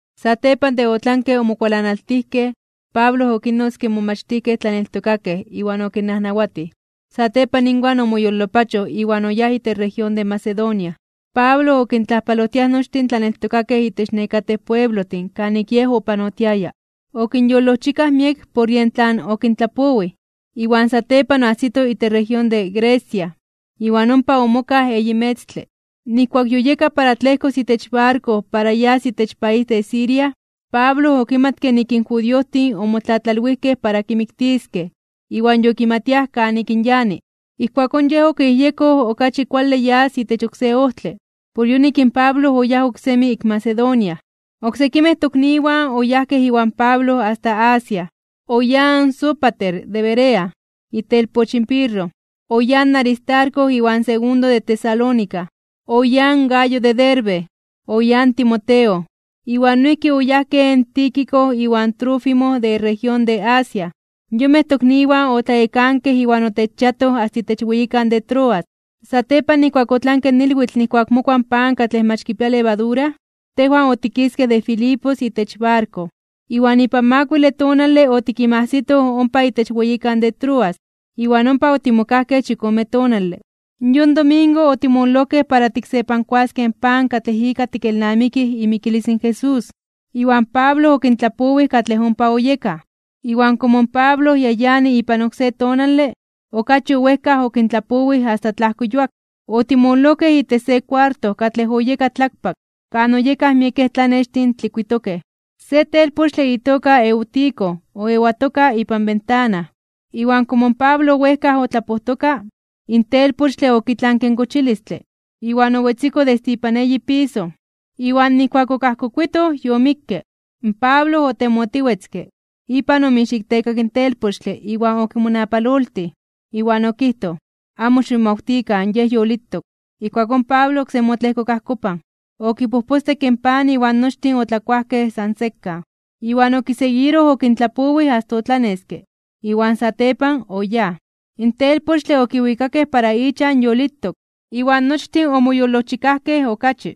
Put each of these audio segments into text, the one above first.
Satepan de otlanke omokualanaltijkej, Pablo okinnotzke in momachtijkej tlaneltokakej iwan okinnajnawatij. Satepan inwan omoyolopachoj iwan oyáj itech región de Macedonia. Pablo okintlajpalojtiaj nochtin in tlaneltokakej itech nekatej pueblojtin kanik yej opanotiaya. Okinyolojchikaj miek por yen tlan okintlapowij. Iwan satepan oajsito itech región de Grecia, iwan ompa omokaj eyi metztle. Nijkuak yoyeka para tlejkos itech barko para yas itech país de Siria, Pablo okimatke nik in judiojtin omotlatlalwijkej para kimiktiskej iwan yokimatiaj kanik in yani. Ijkuakón yej okiyejyekoj okachi kuale yas itech oksé ojtle. Por yonik in Pablo oyáj oksemi ik Macedonia. Oksekimej tokniwan oyajkej iwan Pablo asta Asia. Oyáj in Sópater de Berea, itelpoch in Pirro. Oyáj in Aristarco iwan Segundo de Tesalónica. Oyáj in Gayo de Derbe. Oyáj in Timoteo. Iwan noijki oyajkej in Tíquico iwan Trófimo de región de Asia. Yonmej tokniwan otlayekankej iwan otechchiatoj asta itech weyikan de Troas. Satepan nijkuak otlanke ilwitl nijkuak mokua in pan katlej mach kipia levadura, tejwan otikiskej de Filipos itech barko, iwan ipan makuile tonale otikinmajsitoj ompa itech weyikan de Troas, iwan ompa otimokajkej chikome tonale. Yon domingo otimololojkej para tiksepankuaskej in pan katlej ika tikelnamikij imikilis in Jesús, iwan Pablo okintlapowij katlej ompa oyekaj. Iwan komo in Pablo ya yani ipan oksé tonale, okachi owejkaj okintlapowij asta tlajko yuak. Otimololojkej itech se kuarto katlej oyeka tlakpak, kan oyekaj miekej tlanextin tlikuitokej. Se telpochtle itoka Eutico oewatoka ipan bentana. Iwan komo in Pablo owejkaj otlapojtoka, in telpochtle okitlanke in kochilistle, iwan owetziko desde ipan eyi piso. Iwan nijkuak okajkokuitoj, yomikke. Pablo otemotiwetzke, ipan omixiktekak in telpochtle iwan okimonapaloltij. Iwan okijtoj: ―Amo ximomawtikan, yej yolitok. Ijkuakón Pablo oksemi otlejkok ajkopan. Okipojpostekke in pan iwan nochtin otlakuajkej san sekan. Iwan okiseguiroj okintlapowij asta otlaneske. Iwan satepan oyáj. In telpochtle okiwikakej para ichan yolitok, iwan nochtin omoyolojchikajkej okachi.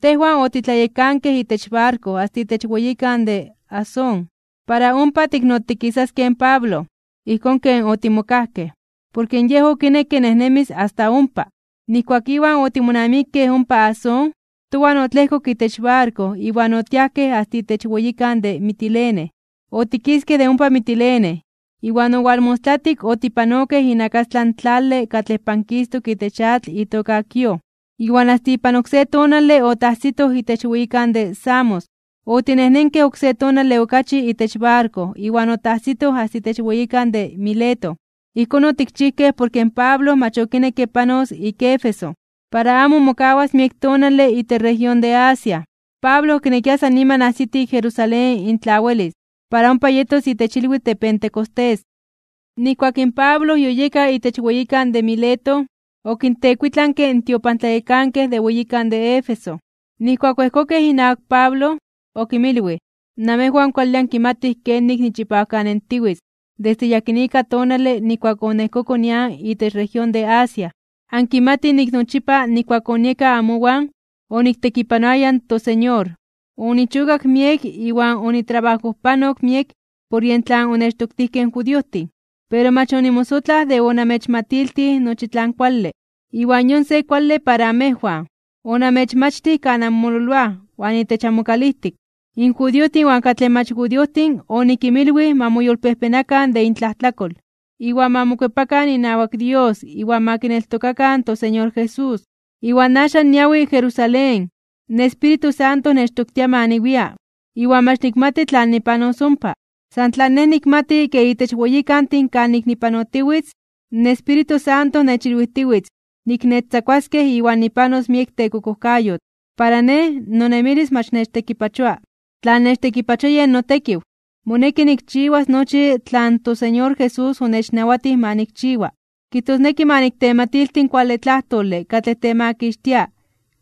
Tejwan otitlayekankej itech barko asta itech weyikan de Asón para ompa tiknotikisaskej in Pablo, ijkón ken otimokajkej, porke yej okinekke nejnemis asta ompa. Nijkuak iwan otimonamikej ompa Asón, towan otlejkok itech barko iwan otiajkej asta itech weyikan de Mitilene. Otikiskej de ompa Mitilene, iwan owalmostlatik otipanokej inakastlan in tlale katlej pankistok itech atl itoka Quío, iwan asta ipan oksé tonale otajsitoj itech weyikan de Samos. Otinejnenkej oksé tonale okachi itech barko iwan otajsitoj asta itech weyikan de Mileto. Ijkón otikchijkej, porke in Pablo mach okinekke panos ik Éfeso, para amo mokawas miek tonale itech región de Asia. Pablo okinekia san niman ajsiti Jerusalén in tla welis, para ompa yetos itech ilwitl de Pentecostés. Nijkuak in Pablo yoyeka itech weyikan de Mileto, okintekuitlanke in tiopantlayekankej de weyikan de Éfeso. Nijkuak oejkokej inawak in Pablo, okinmilwij: ―Namejwan kuale ankimatij kenik nichipawkanentiwitz desde yakinika tonale nijkuak oniejkoko nian itech región de Asia. Ankimatij nik nochipa nijkuak onieka amowan oniktekipanoaya in toSeñor. Onichokak miek iwan onitrabajojpanok miek por yen tlan onechtoktijkej in judiojtin. Pero mach onimosotlaj de onamechmatiltij nochi tlan kuale, iwan yon se kuale para amejwan. Onamechmachtij kan anmololoaj iwan itech amokalijtik. In judiojtin iwan katlej mach judiojtin onikinmilwij ma moyolpejpenakan (ma moyolkuepakan) de intlajtlakol, iwan ma mokuepakan inawak Dios iwan ma kineltokakan in toSeñor Jesús. Iwan axan niawi Jerusalén, in Espíritu Santo nechtoktia ma niwia, iwan mach nikmati tlan nipanos ompa. San tlan nej nikmati ke itech weyikantin kanik nipanotiwitz, in Espíritu Santo nechilwijtiwitz nik nechtzakuaskej iwan nipanos miek tekokojkayotl. Para nej, nonemilis mach nechtekipachoa. Tlan nechtekipachoa yen notekiw. Moneki nikchiwas nochi tlan in toSeñor Jesús onechnawatij ma nikchiwa. Kijtosneki ma niktematilti in kuale tlajtole katlej temakixtia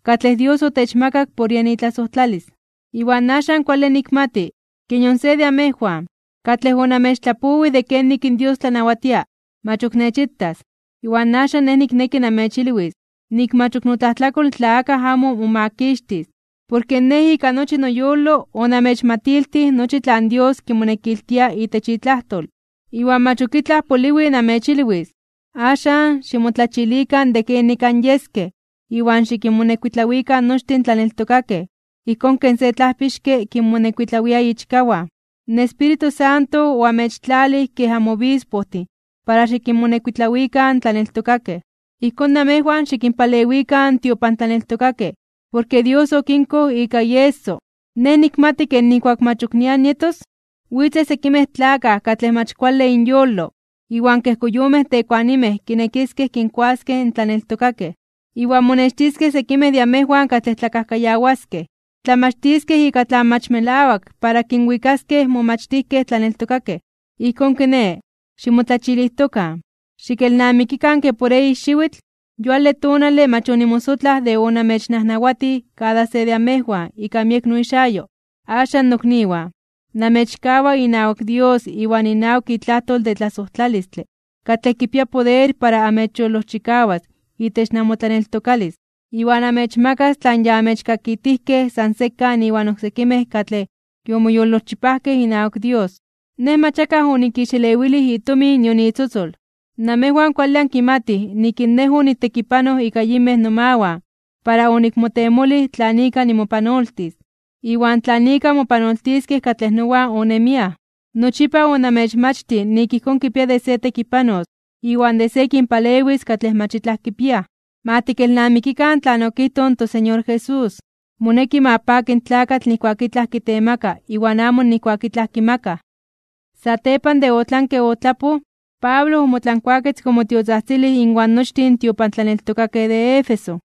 katlej Dios otechmakak por yen itlasojtlalis. ’Iwan axan kuale nikmati, ke nion se de amejwan, katlej onamechtlapowij de kenik in Dios tlanawatia, mach ok nechitas. Iwan axan nej nikneki namechilwis nik mach ok notlajtlakol tla akaj amo momakixtis. Porke nej ika nochi noyolo onamechmatiltij nochi tlan Dios kimonekiltia itech itlajtol, iwan mach ok itlaj poliwi namechilwis. Axan, ximotlachilikan de kenik anyeskej iwan xikinmonekuitlawikan nochtin in tlaneltokakej ijkón kej se tlajpixke kinmonekuitlawia ichkawan. In Espíritu Santo oamechtlalij kej amobispojtin (antlajpixkej) para xikinmonekuitlawikan in tlaneltokakej. Ijkón namejwan xikinpalewikan in tiopantlaneltokakej porke Dios okinkoj ika ieso. Nej nikmati ke nijkuak mach ok nian nietos, witzej sekimej tlakaj katlej mach kuale inyolo iwan kej koyomej tekuanimej kinekiskej kinkuaskej in tlaneltokakej. Iwan monextiskej sekimej de amejwan katlej tlakajkayawaskej, tlamachtiskej ika tlan mach melawak para kinwikaskej in momachtijkej tlaneltokakej. Ijkón kiné, ximotlachilijtokan, xikelnamikikan ke por eyi xiwitl, yuale tonale, mach onimosotlaj de onamechnajnawatij kada se de amejwan ika miek noixayo. ’Axan, nokniwan, namechkawa inawak Dios iwan inawak itlajtol de tlasojtlalistle katlej kipia poder para amechyolojchikawas itech namotlaneltokalis, iwan amechmakas tlan ya amechkakitijkej san sekan inwan oksekimej katlej yomoyolchipajkej inawak Dios. Nej mach akaj onikixelewilij itomin nion itzotzol. Namejwan kuale ankimatij nik in nej onitekipanoj ika yinmej nomawan para onikmotemolij tlan ika nimopanoltis, iwan tlan ika mopanoltiskej katlej nowan onemiaj. Nochipa onamechmachtij nik ijkón kipia de se tekipanos iwan de se kinpalewis katlej mach itlaj kipiaj. Ma tikelnamikikan tlan okijtoj in toSeñor Jesús: “Moneki ma paki in tlakatl nijkuak itlaj kitemaka iwan amo nijkuak itlaj kimakaj.” Satepan de otlanke otlapoj, Pablo omotlankuaketzke omotiotzajtzilij inwan nochtin in tiopantlaneltokakej de Éfeso.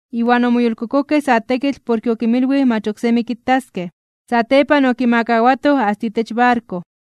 Iwan omoyolkokojkej sa tekitl porke okinmilwij mach oksemi kitaskej. Satepan okimakawatoj asta itech barko.